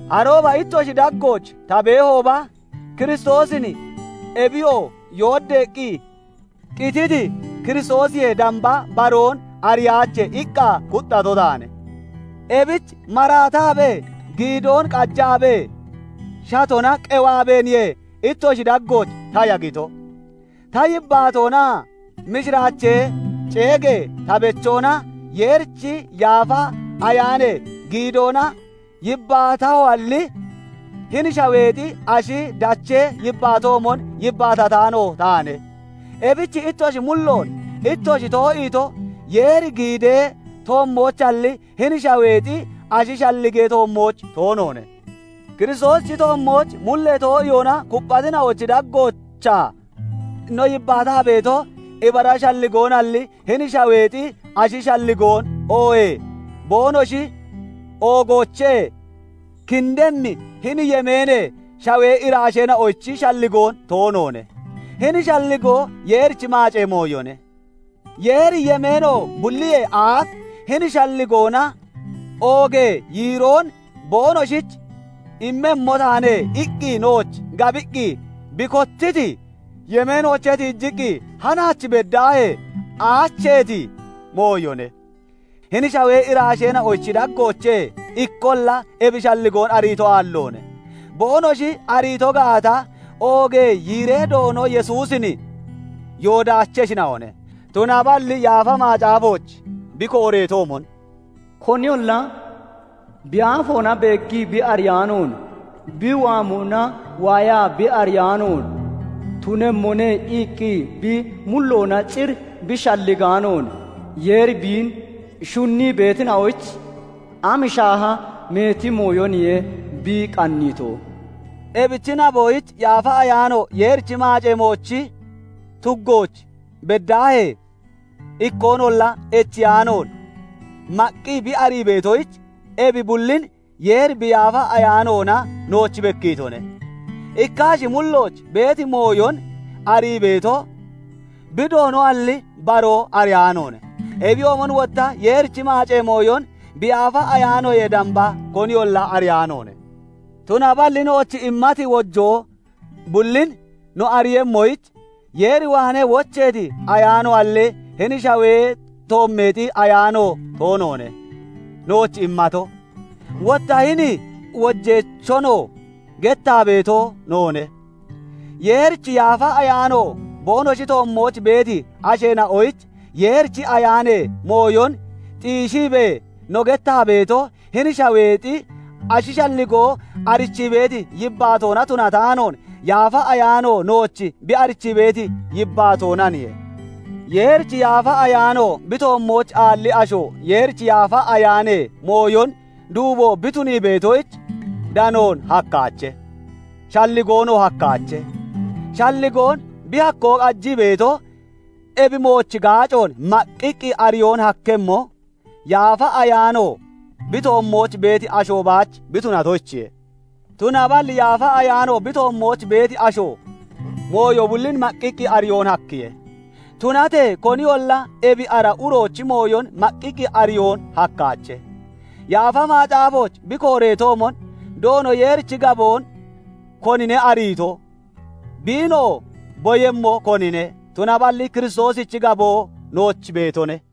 Arooba ittoshi daggooch ta beehooba, "Kiristoosin, ebiyoo yooddeeqqi qititi Kiristoosiyee damba, baroon ariyaache" iqqa kuxxato taane. Ebich maraataabee, giidoo qajaabee, shatona qewaabeeniye ittoshi daggooch ta yagito. Ta yibbaatoonaa mishiraachee ceegee ta bechoona Yeerichi Yaafa Ayaanee giidoona yibbaatahoalli, hini shaweexi ashi dachee yibbaatoomon yibbaatataano taane. Ebich ittoshi mulloon ittoshi too'iito, Yeeri giidee toommoochalli, hini shaweexi ashi shalligee toommooch toonoone. Kiristoosichi toommooch mullee too'iyoona kupphatina'ochi daggoochaa no yibbaataa beeto, ibara shalligoonalli, hini shaweexi ashi shalligoon, oohee boonoshi oogoochee kindemmi hini yemeenee shawee iraasheena'ochi shalligoon toonoone; hini shalligoo Yeerichi maacee mooyone; Yeeri yemeeno bulliyee aaf "Hini shalligoona oogee yiiroon boonoshich immemmo taane" iqqi nooch gabiqqi bi kotiiti yemeenoochee tiijiqqi hanaach beddaahee, aacheeti mooyone. Hini shawee iraasheena'ochi daggoochee ikkolla ebi shalligoon ariito aalloone; boonoshi ariito gaata, oogee yiiree Doono Yesuusin yoodaacheshina'one. Tunaballi Yaafa Macaafooch bi kooreetoomon, "Koniyolla bi aafoona beeggii bi ariyaanoon, bi waamona waayaa bi ariyaanoon, 'Tunemmone' iqqi bi mulloona cir bi shalligaanoon, Yeeri biin shunnii beetina'oyich am shaaha meeti mooyoniye bi qanniito" Ebichi naboyich Yaafa Ayaano Yeerichi maacee moochi tuggooch beddaahee, ikkoonolla echiyaa'oon maqqi bi arii beetoyich, ebi bullin Yeeri bi Yaafa Ayaanoona nooch bekkiitone. Ikka ashi mullooch beeti mooyon arii beeto, bi doonoalli, baroo ariyaanoone; ebiyoomon wotta Yeerichi maacee mooyon bi Yaafa Ayaanoyee damba koniyolla ariyaanoone. Tunaballi nooch immati wojoo bullin no ariiyemmoyich, Yeer waanee wocheeti Ayaanoalli, hini shawee toommeexi ayaano toonoone nooch immato. Wotta hini wojeechonoo gettaa beeto noone. Yeerichi Yaafa Ayaano boonoshi toommooch beeti asheena'oyich, Yeerichi Ayaanee mooyon xiishiibee no gettaa beeto, hini shaweexi ashi shalligoo arichii beeti yibbaatoona tunataanoon, Yaafa Ayaano nooch bi arichii beeti yibbaatoonaniye. Yeerichi Yaafa Ayaano bi toommooch aalli asho Yeerichi Yaafa Ayaanee mooyon duubo bi tunii beetoyich, danoon hakkaache; shalligoonoo hakkaache; shalligoon bi hakkoo qajii beeto, ebi moochi gaacoon maqqiqqi ariyoon hakkemmo, Yaafa Ayaano bi toommooch beeti asho baach bi tunatoyichiye. Tunaballi Yaafa Ayaano bi toommooch beeti asho mooyo bullin maqqiqqi ariyoon hakkiye; tunatee koniyolla ebi ara uroochi mooyon maqqiqqi ariyoon hakkaache. Yaafa Macaafooch bi kooreetoomon, "Doono Yeerichi gaboon konine ariito? Biinoo boyemmo konine?" Tunaballi Kiristoosichi gaboo nooch beetone.